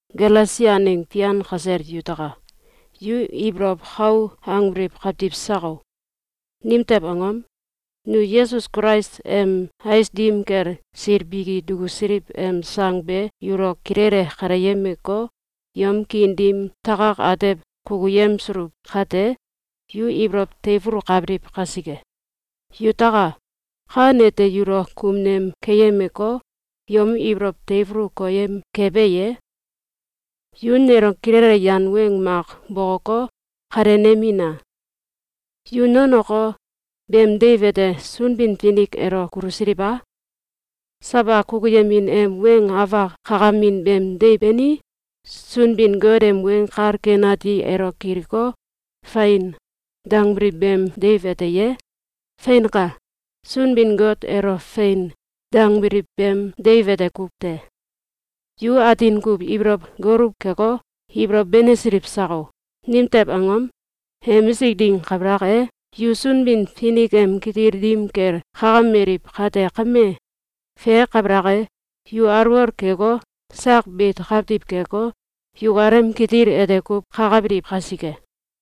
Galesia aneng fian kasel yutaka! Yu ibolow kou angbiliw kawtiw sako? Nimtew angom? Nu Yesus Kulais em ais dim kel sil biki dukusiliw em sang be yulo kilele kaleyemeko, yom kiin dim takak atew kukuyemsuluw kate, yu ibolow teifulukabiliw kasike. Yutaka! Kan ete yulo kumnem keyemeko, yom ibolow teifulu koyem kebe ye? Yu nelo kilele yan weng mak bokoko, kalenemina! Yu nonoko, beem deiw ete Sunbin-Finik elo kulusiliw a? Sawa kukuyemin em weng afak kakamin beem deiw bani, Sunbin-Got em Weng Kal Ken Ati elo kiliko, “Fein!”, dangbiliw beem deiw ete ye? Feinka! Sunbin-Got elo “Fein!”, dangbiliw beem deiw ete kuw te! Yu atin kuw ibolow goluw keko, ibolow benesiliw sako? Nimtew angom? Emisik ding kabalak e, yu Sunbin-Finik em kitil dim kel kakameliw kate kame, fe kabalak e, yu alwol keko, sak beit kawtiw keko, yukalem kitil ete kuw kakabiliw kasike.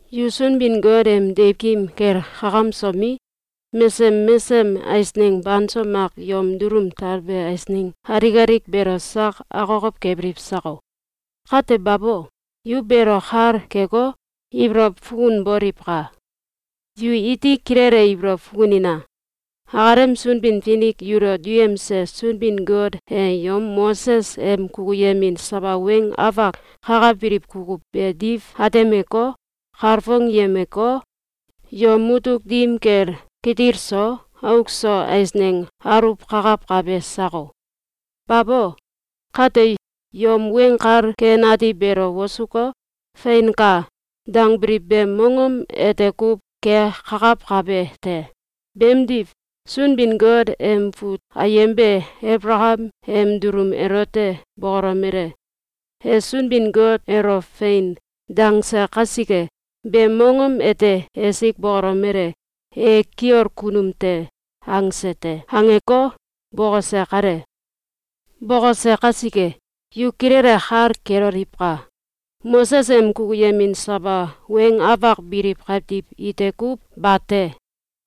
Yu Sunbin-Got em deiwkim kel kakamsomi, mesesem mesesem eisneng banso mak yom dulum talbe eisneng alik alik beelo sak akokow kebiliw sako? Kate babo! Yu beelo kal keko, ibolow fukunboliwka! Yu iti kilele ibolow fukunina! Akalem Sunbin-Finik yulo duyemse Sunbin-Got e yom Moses em kukuyemin sawa weng afak kakabiliw kukuw be diw atemeko, kalfongyemeko, yom mutuk dim kel kitil so auk so eisneng aluwkakawkabe sako? Babo! Kate, yom Weng Kal Ken Ati beelo wosuko, “Feinka!”, dangbiliw beem mongom ete kuw kekakawkabe te. Beemdiw Sunbin-Got em fut ayem be Abalakam em dulum elote bokolomele: “E Sunbin-Got elo ‘Fein!’, dangse kasike, beem mongom ete esik bokolomele: ‘E kiol kunum te!’, angse te.”, angeko, bokose kale. Bokose kasike, yu kilele kal keloliwka! Moses em kukuyemin sawa weng afak biliw kawtiw ite kuw bate.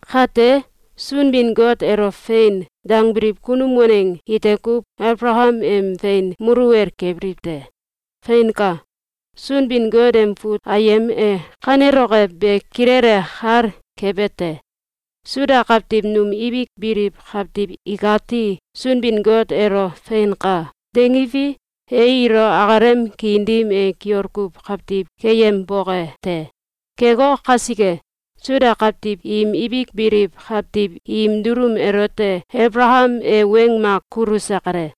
Kate, Sunbin-Got elo ‘Fein!’, dangbiliw kunum waneng ite kuw Abalakam em fein muluwel kebiliw te. Feinka! Sunbin-Got em fut ayem e kaneloke be kilele kal kebete: Suda kawtiw num ibik biliw kawtiw ikati Sunbin-Got elo “Feinka!”, dangiwi, e ilo akalem kiin dim e kiol kuw kawtiw keyemboke te. Keko kasike, Suda kawtiw im ibik biliw kawtiw im dulum elote Abalakam e weng mak kuluse kale.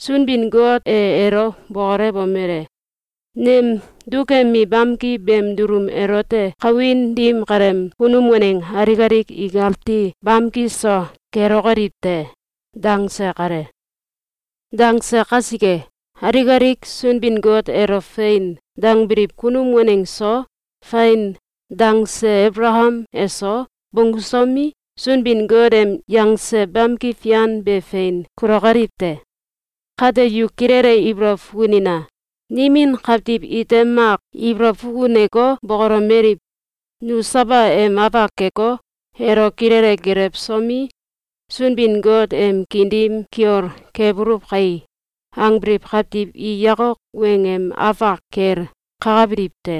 Sunbin-Got e elo bokolewomele: “Nem dukemi bamki beem dulum elote kawin dim kaleem kunum waneng alik alik ikati bamki so kelokoliw te!”, dangse kale. Dangse kasike, alik alik Sunbin-Got elo “Fein!”, dangbiliw kunum waneng so, “Fein!”, dangse Abalakam eso, bonggusomi, Sunbin-Got em yangse bamki fian be fein kulokoliw te. Kate yu kilele ibolow fukunina! Nimin kawtiw ite mak ibolow fukuneko bokolomeliw: “Nu sawa em afak keko, elo kilele gelewsomi, Sunbin-Got em kiin dim kiol kebuluw kai!”, angbiliw kawtiw i yakok weng em afak kel kakabiliw te.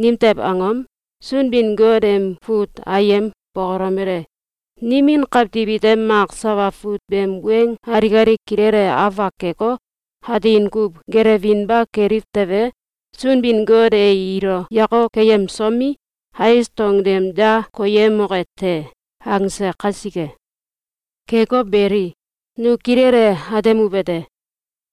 Nimtew angom? Sunbin-Got em fut ayem bokolomele: “Nimin kawtiw ite mak sawa fut beem weng alik alik kilele afak keko, atin kuw gelewinba keliw tewe, Sunbin-Got e ilo yakok keyemsomi, ais dong tem da koyemoke te!”, angse kasike. Keko beli, nu kilele atemuwete: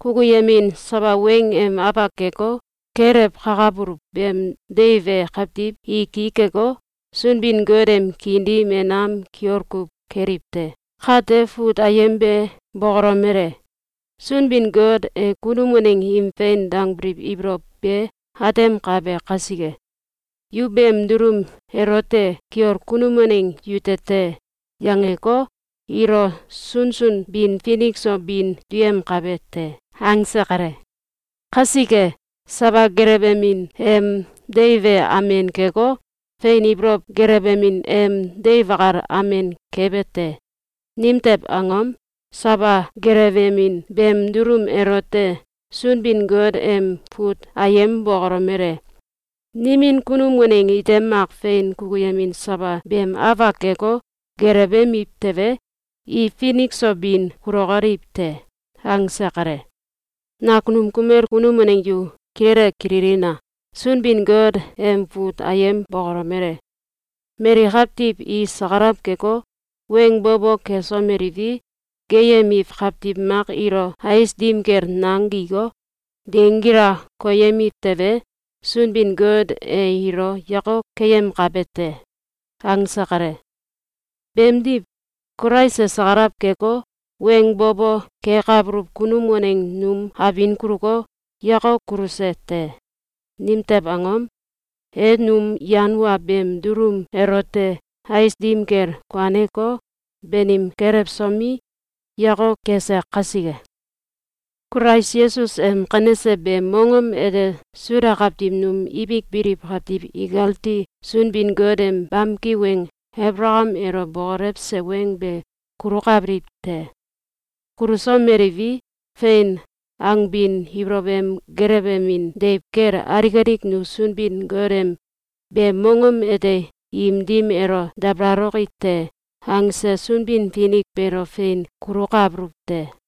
Kukuyemin sawa weng em afak keko, gelewkakabuluw beem deiw e kawtiw i ki keko, Sunbin-Got em kiin dim e nam kiol kuw keliw te. Kate fut ayem be bokolomele: “Sunbin-Got e kunum waneng im fein dangbiliw ibolow be atemkabe kasike, ‘Yu beem dulum elote kiol kunum waneng yute te!’, yangeko, ilo sunsun bin finik so bin duyemkabe te.”, angse kale. Kasike, sawa gelewemin em deiw e amen keko, fein ibolow gelewemin em deiw akal amen kebe te. Nimtew angom? Sawa gelewemin beem dulum elote Sunbin-Got em fut ayem bokolomele: “Nimin kunum waneng ite mak fein kukuyemin sawa beem afak keko, gelewemiw tewe, i finik so bin kulokoliw te.”, angse kale. Nakunum kumel kunum waneng yu kilele kililina! Sunbin-Got em fut ayem bokolomele: “Mali kawtiw i sakalaw keko, weng bo bo kesomeliwi, geeyemiw kawtiw mak ilo ais dim kel nang giko, dengila koyemiw tewe, Sunbin-Got e ilo yakok keyemkabe te!”, angse kale. Beemdiw, Kulais e sakalaw keko, weng bo bo kekabuluw kunum waneng num abin kuluko, yakok kuluse te. Nimtew angom? E num yan wa beem dulum elote ais dim kel kuaneko, banim kelewsomi, yakok kese kasike. Kulais Yesus em kanese beem mongom ete Suda kawtiw num ibik biliw kawtiw ikati Sunbin-Got em bamki weng Abalakam elo bokolewse weng be kulukabiliw te. Kulusomeliwi, “Fein!”, angbin ibolow em gelewemin deiw kel alik alik nu Sunbin-Got em “Beem mongom ete im dim elo dabalaloki te!”, angse Sunbin-Finik beelo fein kulukabuluw te.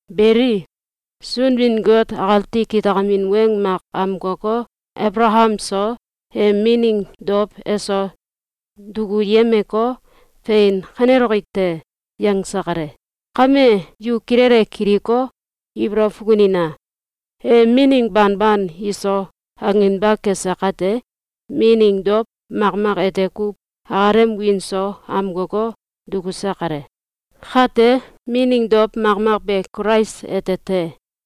Beli, Sunbin-Got akati kitakamin weng mak amkoko, Abalakam so, em mining dow eso dukuyemeko, “Fein kaneloki te!”, yangse kale. Kame yu kilele kiliko, ibolow fukunina! E mining banban iso, anginba kese kate, mining dow makmak ete kuw akalem wiin so amkoko, dukuse kale. Kate mining dow makmak be Kulais ete te.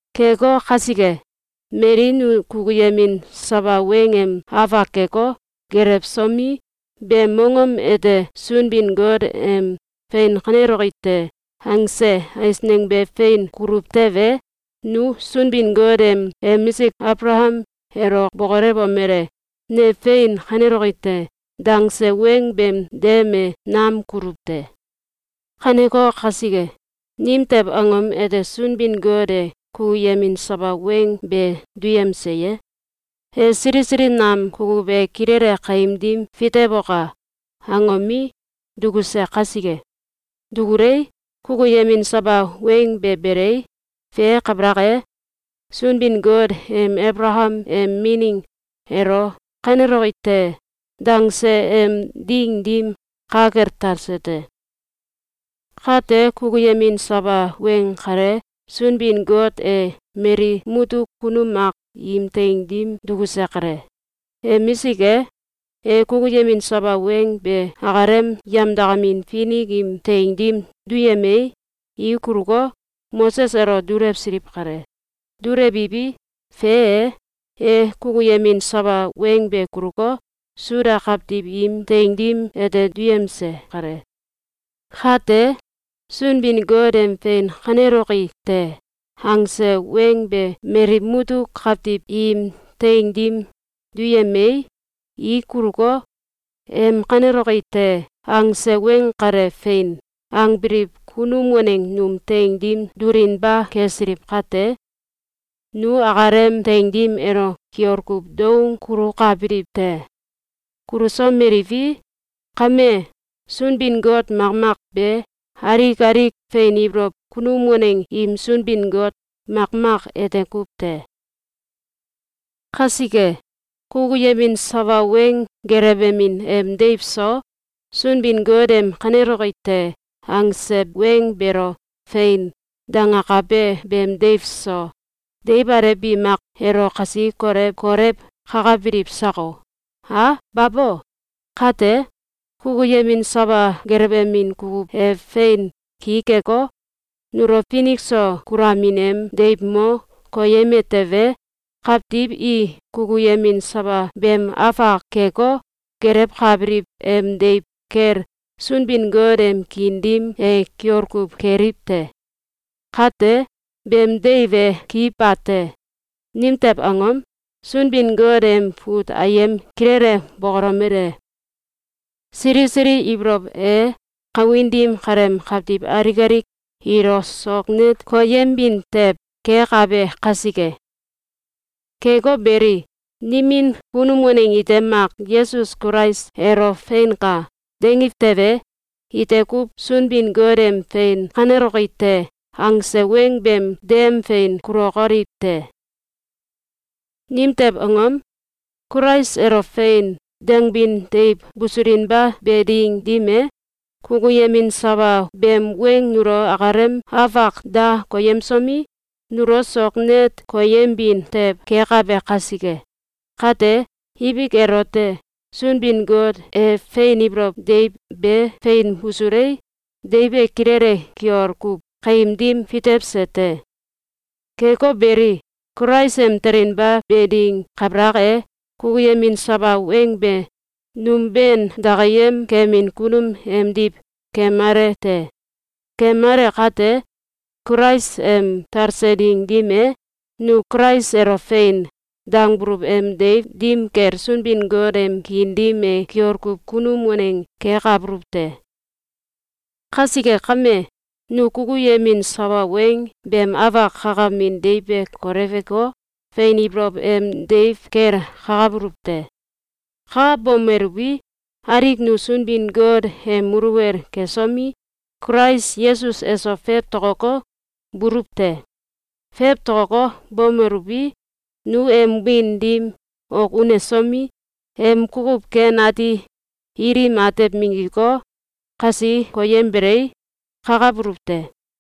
Keko kasike, mali nu kukuyemin sawa weng em afak keko, gelewsomi, beem mongom ete Sunbin-Got em “Fein kaneloki te!”, angse eisneng be fein kuluw tewe, nu Sunbin-Got em emisik Abalakam elo bokolewomele: “Ne fein kaneloki te!”, dangse weng beem dem e nam kuluw te. Kaneko kasike, nimtew angom ete Sunbin-Got e kukuyemin sawa weng be duyemse ye? E “Sili sili nam kukuw e kilele kaim dim fitewoka!”, angomi, dukuse kasike. Dukulei, kukuyemin sawa weng be belei, fe kabalak e, Sunbin-Got em Abalakam em mining elo “Kaneloki te!”, dangse em ding dim ka kel talse te. Kate, kukuyemin sawa weng kale Sunbin-Got e mali mutuk kunum mak im teing dim dukuse kale. Emisik e, e kukuyemin sawa weng be akalem yemdakamin finik im teing dim duyemei, i kuluko, Moses elo dulewsiliw kale. Dulewiwi, fe e, e kukuyemin sawa weng be kuluko, Suda kawtiw im teing dim ete duyemse kale. Kate, Sunbin-Got em “Fein kaneloki te!”, angse weng be mali mutuk kawtiw im teing dim duyemei, i kuluko, em “Kaneloki te!”, angse weng kale “Fein!”, angbiliw kunum waneng num teing dim dulinba kesiliw kate, nu akalem teing dim elo kiol kuw doung kulukabiliw te. Kulusomeliwi, kame, Sunbin-Got makmak be alik alik fein ibolow kunum waneng im Sunbin-Got makmak ete kuw te. Kasike, kukuyemin sawa weng gelewemin em deiw so, Sunbin-Got em “Kaneloki te!”, angse weng beelo “Fein!”, dangakabe beem deiw so, deiw alew bi mak elo kasi kolew kolew kakabiliw sako? A babo! Kate, kukuyemin sawa gelewemin kukuw e fein ki keko, nulo finik so kulamin em deiw mo koyeme tewe, kawtiw i kukuyemin sawa beem afak keko, gelewkabiliw em deiw kel Sunbin-Got em kiin dim e kiol kuw keliw te. Kate, beem deiw e ki bate. Nimtew angom? Sunbin-Got em fut ayem kilele bokolomele: Sili sili ibolow e kawin dim kaleem kawtiw alik alik ilo sok net koyembin tew kekabe kasike. Keko beli, nimin kunum waneng ite mak Yesus Kulais elo “Feinka!”, dangiw tewe, ite kuw Sunbin-Got em “Fein kaneloki te!”, angse weng beem dem fein kulokoliw te. Nimtew angom? Kulais elo “Fein!”, dangbin deiw busulinba be ding dim e, kukuyemin sawa beem weng nulo akalem afak da koyemsomi, nulo sok net koyembin tew kekabe kasike. Kate, ibik elote, Sunbin-Got e fein ibolow deiw be fein busulei, deiw be kilele kiol kuw kaim dim fitewse te. Keko beli, Kulais em telinba be ding kabalak e, kukuyemin sawa weng be num ben dakiyem kemin kunum emdiw kemale te. Kemale kate, Kulais em talse ding dim e, nu Kulais elo “Fein!”, dangbuluw em deiw dim kel Sunbin-Got em kiin dim e kiol kuw kunum waneng kekabuluw te. Kasike kame, nu kukuyemin sawa weng beem afak kakamin deiw be koleweko, fein ibolow em deiw kel kakabuluw te. Kakabomeluwi, alik nu Sunbin-Got em muluwel kesomi, Kulais Yesus eso fewtokoko, buluw te. Fewtokoko, bomeluwi, nu em wiin dim ok unesomi, em kukuw ken ati ilim atew minggiko, kasi koyembelei, kakabuluw te.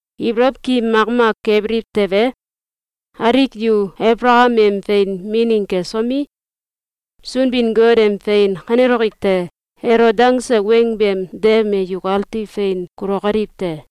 Ibolow ki makmak kebiliw tewe, alik yu Abalakam em fein mining kesomi, Sunbin-Got em “Fein kaneloki te!”, elo dangse weng beem dem be yukati fein kulokoliw te.